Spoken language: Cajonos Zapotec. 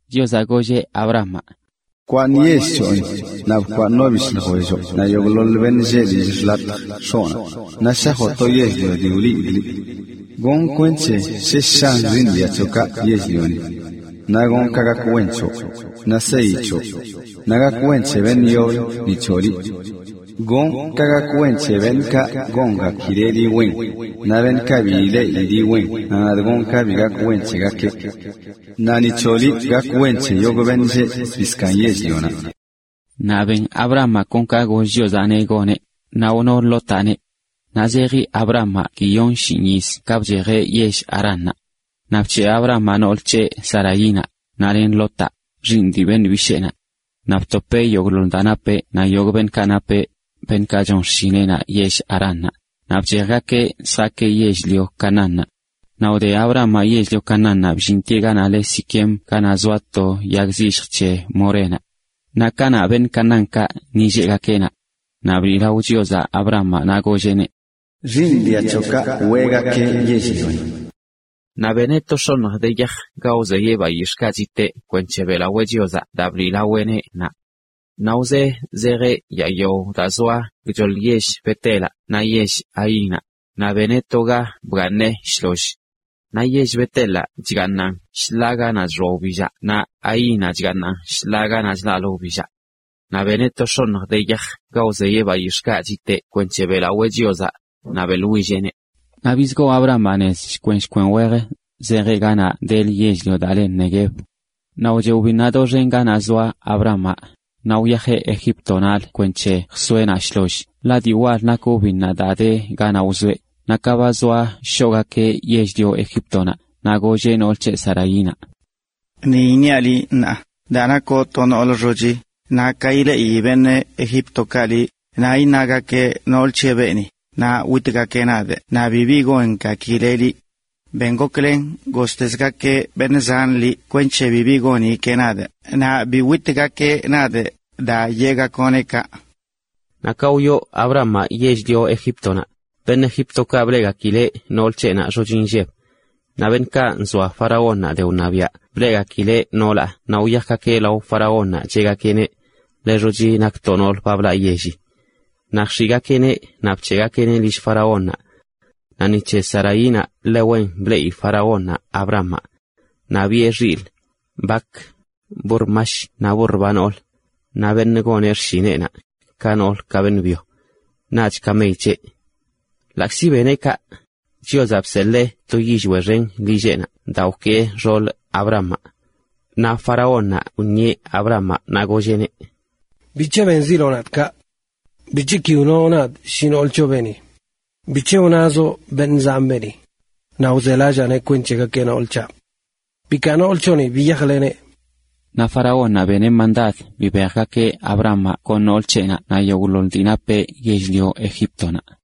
Chiozaꞌ golleꞌ Abramaꞌ: “Bkwaaṉ yell c̱hoꞌni, naꞌ bkwaaṉ no bishꞌ ljwelloꞌ naꞌ yogꞌḻoḻ beṉꞌ lleꞌ lill xḻatjə x̱oꞌnaꞌ, naꞌ shajoꞌ to yell-lio dii wliidꞌ liꞌ. Gonꞌ kwenc̱he shesh shan xiiṉ dia c̱hoꞌkaꞌ yell-lioni. Naꞌ gonꞌ ka gak wen c̱hoꞌ, naꞌ seyi c̱hoꞌ, naꞌ gak wen c̱he beṉꞌ yoblə ni c̱hoꞌ liꞌ. Gonꞌ ka gak wen c̱he beṉꞌkaꞌ gongakileꞌ liꞌ wen, naꞌ beṉꞌkaꞌ bi ileꞌi liꞌ wen nadꞌ gonꞌ ka bi gak wen c̱hegakeꞌ. Naꞌ ni c̱hoꞌ liꞌ gak wen c̱he yogꞌ beṉꞌ lleꞌ zbii zkaaṉ yell-lioni.” Naꞌ ben Abramaꞌ kon ka goll Chiozaꞌneꞌ goneꞌ, naꞌ wno Lotaꞌneꞌ. Naꞌ zeji Abramaꞌ guiyon shinꞌ yiz ka bchejeꞌ yell Haránnaꞌ. Naꞌ bc̱heꞌ Abramaꞌ nool c̱heꞌ, Saraínaꞌ, naꞌ len Lotaꞌ, xiiṉ dii beṉꞌ bisheenaꞌ. Naꞌ btopeꞌ yogꞌḻoḻ daa napeꞌ naꞌ yogꞌ beṉꞌkaꞌ napeꞌ, beṉꞌkaꞌ chon xshineꞌnaꞌ yell Haránnaꞌ, naꞌ bchejgakeꞌ zjaakeꞌ yell-lio Canaánnaꞌ. Naꞌ wde Abramaꞌ yell-lio Canaánnaꞌ bllintieꞌ ganaꞌ le Siquem ganaꞌ zoa to yag zilljə c̱he Morénaꞌ. Naꞌ kanaꞌ beṉꞌ Canaánkaꞌ ni lleꞌgakeꞌ naꞌ. Naꞌ bliꞌlao Chiozaꞌ Abramaꞌ, naꞌ golleꞌneꞌ: “Xiiṉ dia c̱hoꞌkaꞌ weꞌgakee yell-lioni.” Naꞌ beneꞌ to x̱oṉj de yaj ga wzeyeꞌ bayix̱ꞌkaꞌ chiteꞌ kwenc̱he beꞌlawee Chiozaꞌ daa bliꞌlaweꞌneꞌ naꞌ. Naꞌ wzee zejeꞌ yaa yao daa zoa gchoḻ yell Bet-elaꞌ naꞌ yell Hainaꞌ, naꞌ beneꞌ to ga bgaaṉeꞌ shloll. Naꞌ yell Bet-elaꞌ chgaaṉan shḻaa ganaꞌ chxoa wbillaꞌ naꞌ Hainaꞌ chgaaṉan shḻaa ganaꞌ chlaꞌlə wbillaꞌ. Naꞌ beneꞌ to x̱oṉj de yaj ga wzeyeꞌ bayix̱ꞌkaꞌ chiteꞌ kwenc̱he beꞌlawee Chiozaꞌ, naꞌ beꞌḻwilleꞌneꞌ. Naꞌ bizgoo Abramaꞌ nez shkwen shkwen wej, zejeꞌ ganaꞌ delə yell-lio daa le Neguev. Naꞌ wcheꞌ wbinnaꞌ doxen ganaꞌ wzoa Abramaꞌ, naꞌ wyajeꞌ Egíptonaꞌlə kwenc̱he jsoeꞌ naꞌ shloll, ḻaꞌ dii wal nak wbinnaꞌ daa de ganaꞌ wzoeꞌ. Naꞌ ka ba zoa shoꞌgakeꞌ yell-lio Egíptonaꞌ, naꞌ golleꞌ nool c̱heꞌ, Saraínaꞌ: “Ni iṉiaꞌ liꞌ ṉaa, daa nakoꞌ to noolə xochi, ka ileꞌi beṉꞌ Egíptokaꞌ liꞌ, naꞌ iṉagakeꞌ: “Nool c̱heꞌ beeni”, naꞌ witgakeꞌ nadꞌ naꞌ bibi gongakileꞌ liꞌ. Ben goklen golltezgakeꞌ beṉꞌ zanꞌ liꞌ kwenc̱he bibi gongakileꞌ nadꞌ naꞌ bi witgakeꞌ nadꞌ daa yeꞌgakoꞌneꞌ kaꞌ.” Naꞌ ka wyoo Abramaꞌ yell-lio Egíptonaꞌ, beṉꞌ Egíptokaꞌ bleꞌgakileꞌ nool c̱heꞌnaꞌ xochi nlleb. Naꞌ beṉꞌkaꞌ nzoa faraónnaꞌ de wṉabiaꞌ bleꞌgakileꞌ noolaꞌ naꞌ wyajgakeꞌ lao faraónnaꞌ cheꞌgakeꞌneꞌ: “Ḻe xochi nak to noolə ba blaꞌ yelli”. Naꞌ jx̱iꞌgakeꞌneꞌ naꞌ bc̱heꞌgakeꞌneꞌ lill faraónnaꞌ. Naꞌ ni c̱he Saraínaꞌ ḻe wen bleꞌi faraónnaꞌ Abramaꞌ. Naꞌ biꞌe xilꞌ, bak, burr mash naꞌ burr ba noolə, naꞌ beṉꞌ goneꞌ xshineꞌnaꞌ, ka noolə ka beṉꞌ byo, naꞌch kamey c̱heꞌ. Ḻaꞌkzi beneꞌ kaꞌ Chiozaꞌ bseḻee to yillweꞌ xen lill faraónnaꞌ daa wkee xool Abramaꞌ. Naꞌ faraónnaꞌ wṉieꞌ Abramaꞌ naꞌ golleꞌneꞌ: ―¿Bic̱he benziloꞌ nadꞌ kaꞌ? ¿Bic̱he ki wnoꞌ nadꞌ shi nool c̱hoꞌ beeni? ¿Bic̱he wnazoꞌ “beṉꞌ zanꞌ beeni”? Naꞌ wzelallaaneꞌ kwenc̱he gakeꞌ nool c̱haꞌ. ¡Bikaa nool c̱hoꞌni, biyajleneꞌ! Naꞌ faraónnaꞌ beneꞌ byen bibejgakeꞌ Abramaꞌ len nool c̱heꞌnaꞌ naꞌ yogꞌḻoḻ dii napeꞌ yell-lio Egíptonaꞌ.